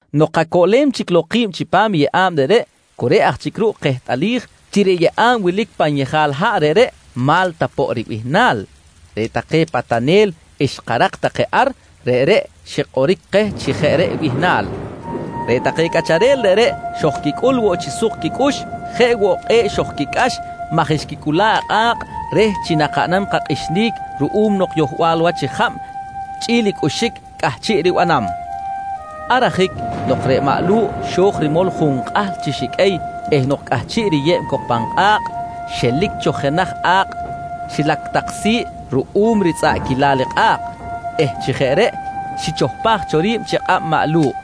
Nok kacoꞌlem chic lok ki̱b chipam yeꞌa̱b reꞌreꞌ, cu reꞌ aj chic ruꞌ kehtꞌalij chi reꞌ yeꞌa̱b wilic pan yejal haꞌ reꞌreꞌ Ma̱lta poꞌ ribihnal. Reꞌ take patanel xkarak take ar reꞌreꞌ xikꞌoric keh chi jeꞌ reꞌ bihnal. Reꞌ take cꞌacharel reꞌreꞌ xojquicꞌul woꞌ chi suk quicꞌux jeꞌ woꞌ kꞌe̱ꞌ xojquicꞌax maj xquicꞌula̱ꞌ i kꞌa̱kꞌ reh chi nakaꞌnam kakꞌixinic ruꞌum nok yohbal wach jab chꞌi̱l cꞌuxic cꞌahchiꞌ ribanam. Ar ajic nok reꞌ maꞌ Lu̱ꞌ xo̱j rimol junkꞌahl chi xiqꞌuey eh nok cꞌahchiꞌ riyeb cok pan kꞌa̱kꞌ, xelic cho jenaj a̱kꞌ xilac tak si̱ꞌ ruꞌum ritzꞌaꞌquilal i kꞌa̱kꞌ eh chi jeꞌ reꞌ xichohpaj cho ri̱b chi kꞌab maꞌ Lu̱ꞌ.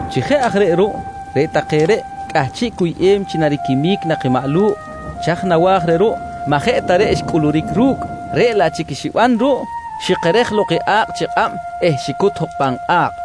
Chi jeꞌ aj reꞌ ruꞌ, reꞌ take reꞌ cꞌahchiꞌ cuyꞌem chi nariquimic nak i maꞌ Lu̱ꞌ, chaj nawa̱j reh ruꞌ maꞌ jeꞌ ta reꞌ xcꞌuluric ru̱cꞌ, reꞌ laꞌ chic i xiban ruꞌ xikerej lok i a̱kꞌ chi kꞌab eh xicut jok pan kꞌa̱kꞌ!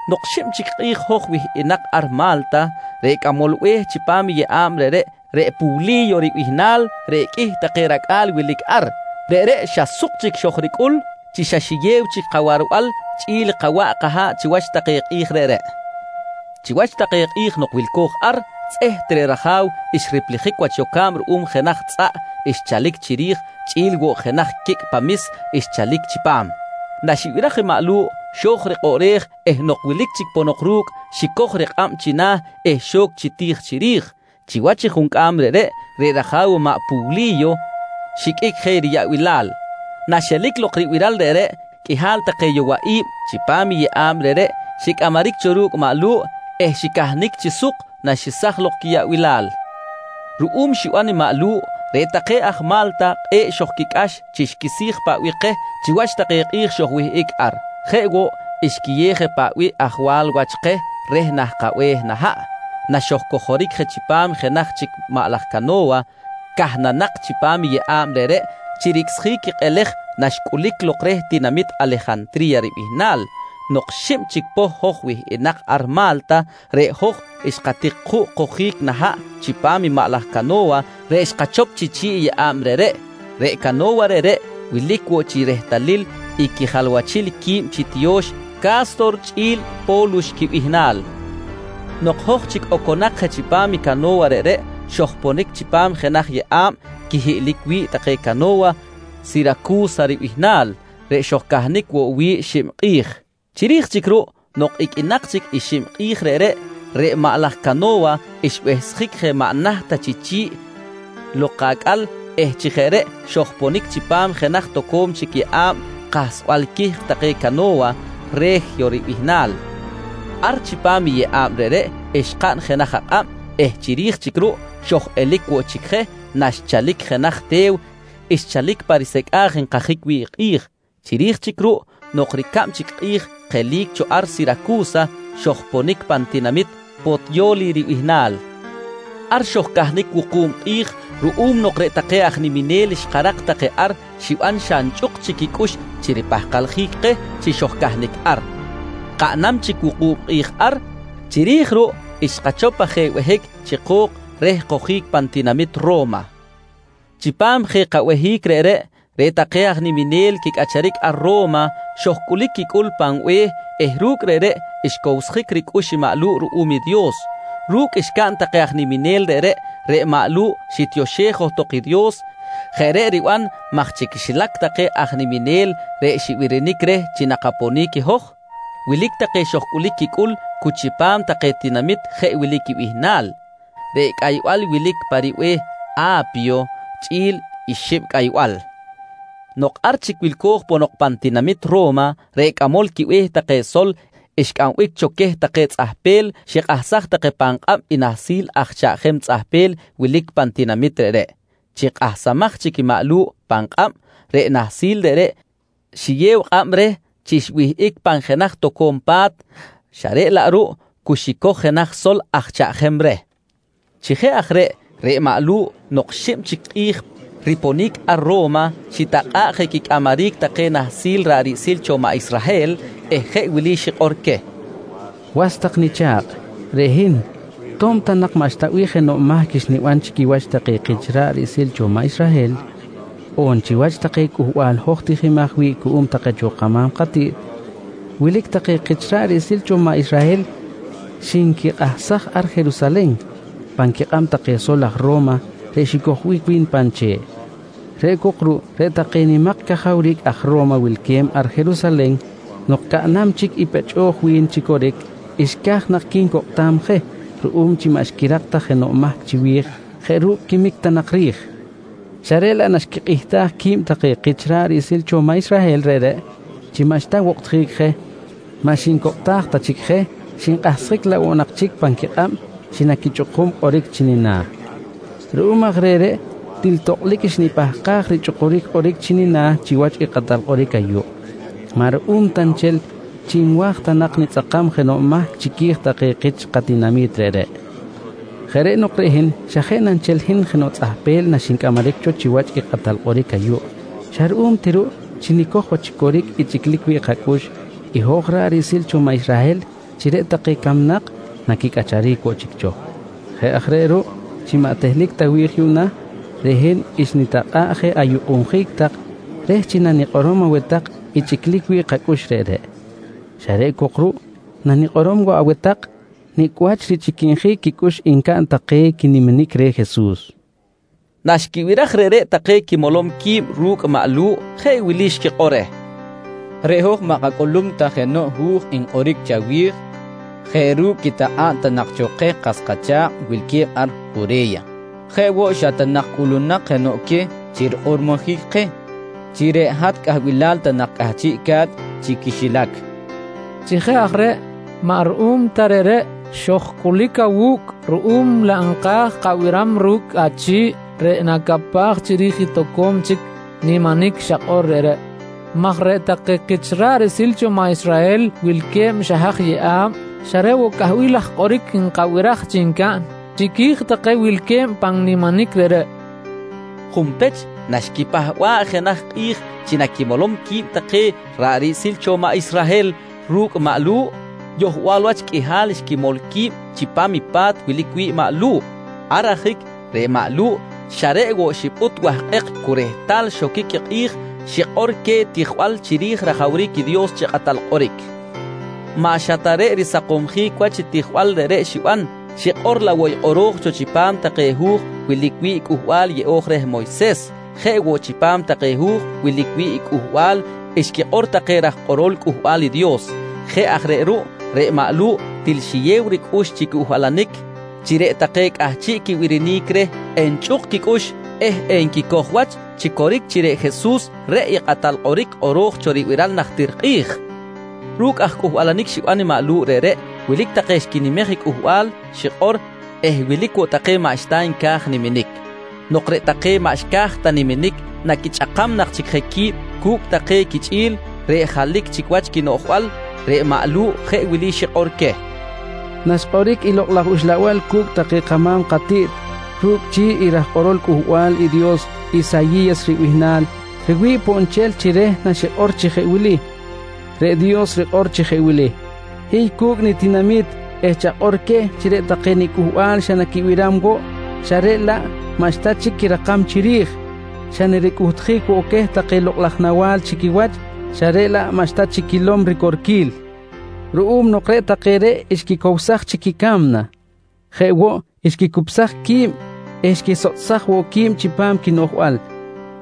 Nok xib chic kꞌi̱j hoj wihꞌinak ar Ma̱lta, reꞌ cꞌamol be̱h chipam i yeꞌa̱b reꞌreꞌ, reꞌ Puwli̱yo ribihnal reꞌ qꞌuih take racꞌa̱l wilic ar, reꞌreꞌ xa suk chic xojricꞌul chi xa xiyew chic kawarbal chꞌi̱l kawaꞌ kaha̱ꞌ chiwach take kꞌi̱j reꞌreꞌ. Chiwach take kꞌi̱j nok wilco̱j ar, tzꞌeht reꞌ raja̱w xriplijic wach yoca̱b ruꞌum jenaj tzꞌaꞌ xchalic chiri̱j chꞌi̱l woꞌ jenaj quicꞌ pamis xchalic chi pa̱m. Naxibiraj i maꞌ Lu̱ꞌ, xo̱j rikꞌoꞌrej eh nok wilic chic ponok ru̱cꞌ, xicoj rikꞌab china̱ eh xo̱c chi ti̱j chiri̱j. Chiwach i juncꞌam reꞌreꞌ, reꞌ raja̱w maꞌ Puwli̱yo xiqꞌuic je riyaꞌbilal. Naxelic lok i ribiral reꞌreꞌ, qꞌuihal take yowaꞌi̱b chipam i yeꞌa̱b reꞌreꞌ xicꞌamaric cho ru̱cꞌ maꞌ Lu̱ꞌ eh xicahnic chi suk naxesaj lok quiyaꞌbilal. Ruꞌum xiban i maꞌ Lu̱ꞌ, reꞌ take aj Ma̱lta kꞌe̱ꞌ xojquicꞌax chi xquisi̱j paꞌ bih keh chiwach take kꞌi̱j xojwihꞌic ar. Jeꞌ woꞌ, xquiyew je paꞌ bih ajwal wach keh reh nah kabe̱h nah haꞌ naxojcojoric je chipam jenaj chic maꞌ laj cano̱wa cahnanak chipam i yeꞌa̱b reꞌreꞌ chi ricꞌsjic i kꞌelej naxcꞌulic lok reh tinamit Alejantri̱ya ribihnal. Nok xib chic poh hoj wihꞌinak ar Ma̱lta, reꞌ hoj xkatik juꞌ kojic nah haꞌ chipam maꞌ laj cano̱wa reꞌ xkachop chi chi̱ꞌ i yeꞌa̱b reꞌreꞌ. Reꞌ cano̱wa reꞌreꞌ wilic woꞌ chi rehtalil i quijalwachil qui̱b chi tiyo̱x Ca̱stor chꞌi̱l Po̱lux quibihnal. Nok hoj chic oconak je chipam i cano̱wa reꞌreꞌ xojponic chipam jenaj yeꞌa̱b quihiꞌlic wi̱ꞌ take cano̱wa Siracu̱sa ribihnal reꞌ xojcahnic woꞌ wi̱ꞌ xib kꞌi̱j. Chiri̱j chic ruꞌ, nok iqꞌuinak chic i xib kꞌi̱j reꞌreꞌ, reꞌ maꞌ laj cano̱wa xbehsjic je maꞌ naht ta chi chi̱ꞌ lok acꞌal eh chi jeꞌ reꞌ xojponic chipam jenaj toco̱m chic yeꞌa̱b kahsbal quihk take cano̱wa, Re̱jyo ribihnal. Ar chipam i yeꞌa̱b reꞌreꞌ xkaꞌn jenaj akꞌab eh chiri̱j chic ruꞌ xoj-elic woꞌ chic je naxchalic jenaj te̱w xchalic pa risecꞌa̱j nkajic wi̱ꞌ kꞌi̱j. Chiri̱j chic ruꞌ nok ricab chic kꞌi̱j kelic cho ar Siracu̱sa xojponic pan tinamit Potyo̱li ribihnal. Ar xojcahnic wuku̱b kꞌi̱j ruꞌum nok reꞌ take aj niminel xkarak take ar xiban xa nchꞌuk chic quicꞌux chi ripahkaljic keh chi xojcahnic ar. Kaꞌnam chic wuku̱b kꞌi̱j ar, chiri̱j ruꞌ xkachop aj je behic chi ko̱k reh kojic pan tinamit Ro̱ma. «Chipam je kabehic reꞌreꞌ, reꞌ take aj niminel quicꞌacharic ar Ro̱ma xojcꞌulic quicꞌul pan be̱h eh ru̱cꞌ reꞌreꞌ xcowsjic ricꞌux i maꞌ Lu̱ꞌ ruꞌum i Dios. Ru̱cꞌ xcaꞌn take aj niminel reꞌreꞌ, reꞌ maꞌ Lu̱ꞌ xitioxej johtok i Dios. Jeꞌ reꞌ riban maj chi quixilac take aj niminel reꞌ xibirinic reh chi nakaponic i hoj, wilic take xojcꞌulic quicꞌul cu chipam take tinamit jeꞌ wili quibihnal: “Reꞌ Cꞌaybal wilic pa ribe̱h A̱pyo” chꞌi̱l i “Xib Cꞌaybal”. Nok ar chic wilco̱j ponok pan tinamit Ro̱ma, reꞌ cꞌamol quibe̱h take sol xcꞌambic cho queh take tzꞌahpel xikꞌahsaj take pan kꞌab i nahsil aj chaꞌjem tzꞌahpel wilic pan tinamit reꞌreꞌ. Chi kꞌahsamaj chic maꞌ Lu̱ꞌ pan kꞌab, reꞌ nahsil reꞌreꞌ xiyew kꞌab reh chi xwihꞌic pan jenaj toco̱m pa̱t, xa reꞌ laꞌ ruꞌ cu xicoj jenaj sol aj chaꞌjem reh. Chi jeꞌ aj reꞌ, reꞌ maꞌ Lu̱ꞌ nok xib chic kꞌi̱j riponic ar Ro̱ma xitakꞌa̱ꞌ je quicꞌamaric take nahsil ra̱ꞌ riꞌsil cho maꞌ Israhel eh jeꞌ wili xikꞌor queh: «Was tak nicha̱kꞌ, reꞌ hin to̱b ta nak maꞌxta bih jenoꞌ mahc xniban chi quiwach take kich ra̱ꞌ riꞌsil cho maꞌ Israhel on chiwach take cꞌuhbal hoj tijimaj wi̱ꞌ cuꞌum take cho kama̱m katiꞌt, wilic take kich ra̱ꞌ riꞌsil cho maꞌ Israhel xinquikꞌahsaj ar Jerusalen pan quikꞌab take sol aj Ro̱ma reꞌ xicojbic wi̱n pan che̱ꞌ. Reꞌ cok ruꞌ reꞌ take nimak cajawric aj Ro̱ma wilque̱b ar Jerusalen nok caꞌnam chic i pechꞌoj wi̱n chi coric, xca̱j nak quincokꞌtam je ruꞌum chi maꞌ xquirak ta jenoꞌ mahc chiwi̱j jeꞌ ru̱cꞌ quimic ta nak ri̱j xa reꞌ laꞌ naxquikꞌihtaj qui̱b take kich ra̱ꞌ riꞌsil cho maꞌ Israhel reꞌreꞌ chi maꞌxta wokꞌtjic je, maꞌ xincokꞌtaj ta chic je xinkꞌahsjic laꞌ woꞌ nak chic pan quikꞌab chi naquichꞌukum i kꞌoric chi nina̱. Ruꞌum aj reh reꞌ til tokꞌlic xnipahkaj richꞌukuric kꞌoric chi nina̱ chiwach i kꞌatal kꞌoric ayuꞌ, maꞌ ruꞌum ta nchel chi nwa̱j ta nak nitzꞌakam jenoꞌ mahc chiqui̱j take kich katinami̱t reꞌreꞌ. Jeꞌ reꞌ nok reꞌ hin xa jeꞌ na nchel hin jenoꞌ tzꞌahpel naxincꞌamaric cho chiwach i kꞌatal kꞌoric ayuꞌ xa ruꞌum ti ruꞌ chi nicoj wach chi coric i chꞌiclic wi̱ꞌ kacꞌux i hoj ra̱ꞌ riꞌsil cho maꞌ Israhel chi reꞌ take camnak naquicꞌacharic woꞌ chic cho. Jeꞌ aj reꞌ ruꞌ, chi maꞌ tehlic ta wi̱j yuꞌna reꞌ hin xnitakꞌa̱ꞌ je ayukꞌunjic tak reh chi nanikꞌorom aweh tak i chꞌiclic wi̱ꞌ kacꞌux reꞌreꞌ. Xa reꞌ cok ruꞌ nanikꞌorom woꞌ aweh tak nicꞌ wach richꞌiquinjic quicꞌux ncaꞌn take quiniminic reh Jesus, nqui maꞌ Lu̱ꞌ. Naxquibiraj reꞌreꞌ take quimolom qui̱b ru̱cꞌ maꞌ Lu̱ꞌ jeꞌ wili xquikꞌor reh: «Reꞌ hoj maꞌ kacꞌulum ta jenoꞌ hu̱j nkꞌoric chawi̱j jeꞌ ru̱cꞌ quitakꞌa̱b ta nak cho keh kas kacha̱kꞌ wilque̱b ar Jure̱ya. Jeꞌ woꞌ, xa ta nak cꞌulunak jenoꞌ queh chi rikꞌormojic keh chi reꞌ hat cꞌahbilal ta nak cꞌahchiꞌca̱t chi quixilac. Chi jeꞌ aj reꞌ maꞌ ruꞌum ta reꞌreꞌ xojcꞌulic awu̱cꞌ ruꞌum laꞌ nka̱j kabiram ru̱cꞌ achi̱ꞌ reꞌ nacapaj chiri̱j i toco̱m chic niminic xakꞌor reꞌreꞌ maj reꞌ take kich ra̱ꞌ riꞌsil cho maꞌ Israhel wilque̱b xa haj yeꞌa̱b xa reꞌ woꞌ cꞌahbil laj kꞌoric nkabiraj chi ncaꞌn chiqui̱j take wilque̱b pan niminic reꞌreꞌ, nqui take reh. Junpech naxquipahba̱ꞌ jenaj kꞌi̱j chi naquimolom qui̱b take ra̱ꞌ riꞌsil cho maꞌ Israhel ru̱cꞌ maꞌ Lu̱ꞌ, yohbal wach qꞌuihal xquimol qui̱b chipam i pa̱t wilic wi̱ꞌ maꞌ Lu̱ꞌ. Ar ajic reꞌ maꞌ Lu̱ꞌ xa reꞌ woꞌ xipꞌut wahkꞌek cu rehtal xoquic i kꞌi̱j, xikꞌor queh tijbal chiri̱j rajawric i Dios chi Kꞌatal Kꞌoric. Maꞌ xa ta reꞌ risakomsjic wach i tijbal reꞌreꞌ xiban, xikꞌor laꞌ woꞌ i kꞌoro̱j cho chipam take hu̱j wilic wi̱ꞌ i Cꞌuhbal Yeꞌo̱j reh Moyses, jeꞌ woꞌ chipam take hu̱j wilic wi̱ꞌ i cꞌuhbal xquikꞌor take raj kꞌorol Cꞌuhbal i Dios. Jeꞌ aj reꞌ ruꞌ, reꞌ maꞌ Lu̱ꞌ til xiyew ricꞌux chi cꞌuhbalanic reh chi reꞌ take cꞌahchiꞌ quibirinic reh enchꞌuk quicꞌux eh enquicoj wach chi coric chi reꞌ i Jesus reꞌ i Kꞌatal Kꞌoric kꞌoro̱j cho ribiral najtir kꞌi̱j. Ru̱cꞌ aj cꞌuhbalanic xiban maꞌ Lu̱ꞌ reꞌreꞌ, wilic take xquinimej i cꞌuhbal xikꞌor eh wilic woꞌ take maꞌxta nca̱j niminic. Nok reꞌ take maꞌ xca̱j ta niminic naquichꞌakam nak chic je qui̱b cu̱cꞌ take quichꞌi̱l reꞌ jalic chic wach quinoꞌjbal, reꞌ maꞌ Lu̱ꞌ jeꞌ wili xikꞌor queh: «Naxkꞌoric i Lokꞌ laj Uxlabal cu̱cꞌ take kama̱m katiꞌt ru̱cꞌ chi̱ꞌ i raj kꞌorol Cꞌuhbal i Dios Isayi̱yas ribihnal, riwi̱ꞌ poꞌ nchel chi reh naxikꞌor chi jeꞌ wili: “Reꞌ Dios rikꞌor chi jeꞌ wili: ‘Hiy cu̱cꞌ nitinami̱t eh chakꞌor queh chi reꞌ take niCꞌuhbal xa naquibiram woꞌ xa reꞌ laꞌ maꞌxta chic quirakam chiri̱j; xa naricꞌuhtjic woꞌ take lokꞌ laj nawa̱l chi quiwach, xa reꞌ laꞌ maꞌxta chic quilom ricorquil ruꞌum nok reꞌ take reꞌ xquicowsaj chic i ca̱mna. Jeꞌ woꞌ xquicupsaj qui̱b eh xquisotꞌsaj woꞌ qui̱b chipam quinoꞌjbal.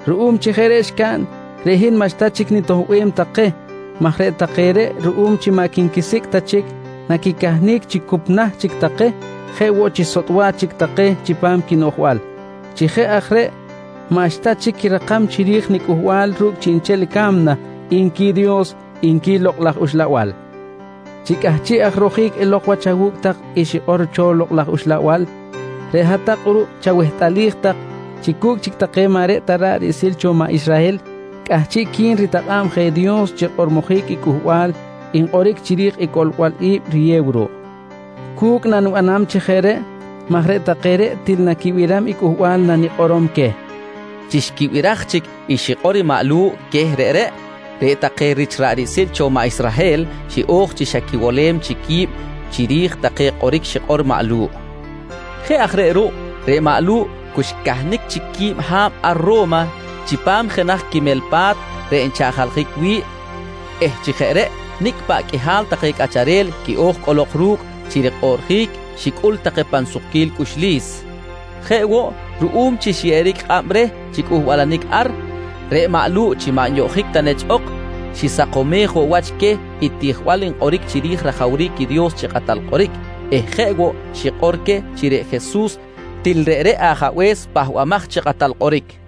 Ruꞌum chi jeꞌ reꞌ xcaꞌn, reꞌ hin maꞌxta chic nitoꞌbem take maj reꞌ take reꞌ ruꞌum chi maꞌ quinquisicꞌ ta chic, naquicahnic chi cup nah chic take jeꞌ woꞌ chi sotꞌ wach chic take chipam quinoꞌjbal. Chi jeꞌ aj reꞌ maꞌxta chic quirakam chiri̱j nicꞌuhbal ru̱cꞌ chiꞌnchel i ca̱mna, nqui Dios, nqui Lokꞌ laj Uxlabal. «Chi cꞌahchiꞌ aj rojic elok wach awu̱cꞌ tak i xikꞌor cho Lokꞌ laj Uxlabal, reꞌ hat-tak kꞌuruꞌ chawehtꞌalij tak chi cu̱cꞌ chic take maꞌ reꞌ ta ra̱ꞌ riꞌsil cho maꞌ Israhel cꞌahchiꞌqui̱n ritakꞌa̱b je Dios chi rikꞌormojic i cꞌuhbal nkꞌoric chiri̱j i coꞌlbal i̱b riyew ruꞌ. Cu̱cꞌ nanibanam chi jeꞌ reꞌ maj reꞌ take reꞌ til naquibiram i cꞌuhbal nanikꞌorom queh, nqui maꞌ Lu̱ꞌ queh. Chi xquibiraj chic i xikꞌor i maꞌ Lu̱ꞌ queh reꞌreꞌ, reꞌ take rich ra̱ꞌ riꞌsil cho maꞌ Israhel xiꞌo̱j chi xa quiwolem chic qui̱b chiri̱j take kꞌoric xikꞌor maꞌ Lu̱ꞌ. Jeꞌ aj reꞌ ruꞌ, reꞌ maꞌ Lu̱ꞌ cu xcahnic chic quib ha̱b ar Ro̱ma chipam jenaj quimel pa̱t reꞌ nchaꞌjaljic wi̱ꞌ eh chi jeꞌ reꞌ nicꞌ paꞌ qꞌuihal take cꞌacharel quiꞌo̱j cꞌolok ru̱cꞌ chi rikꞌoꞌrjic, xicꞌul take pan sukquil cꞌuxlis. Jeꞌ woꞌ, ruꞌum chi xyeꞌeric kꞌab reh chi cꞌuhbalanic ar, reꞌ maꞌ Lu̱ꞌ chi maꞌ nyoꞌjic ta nechꞌ ok, xisakomej woꞌ wach queh i tijbal nkꞌoric chiri̱j rajawric i Dios chi Kꞌatal Kꞌoric eh jeꞌ woꞌ xikꞌor queh chi reꞌ Jesus til reꞌreꞌ Ajabe̱s Pahbamaj chi Kꞌatal Kꞌoric.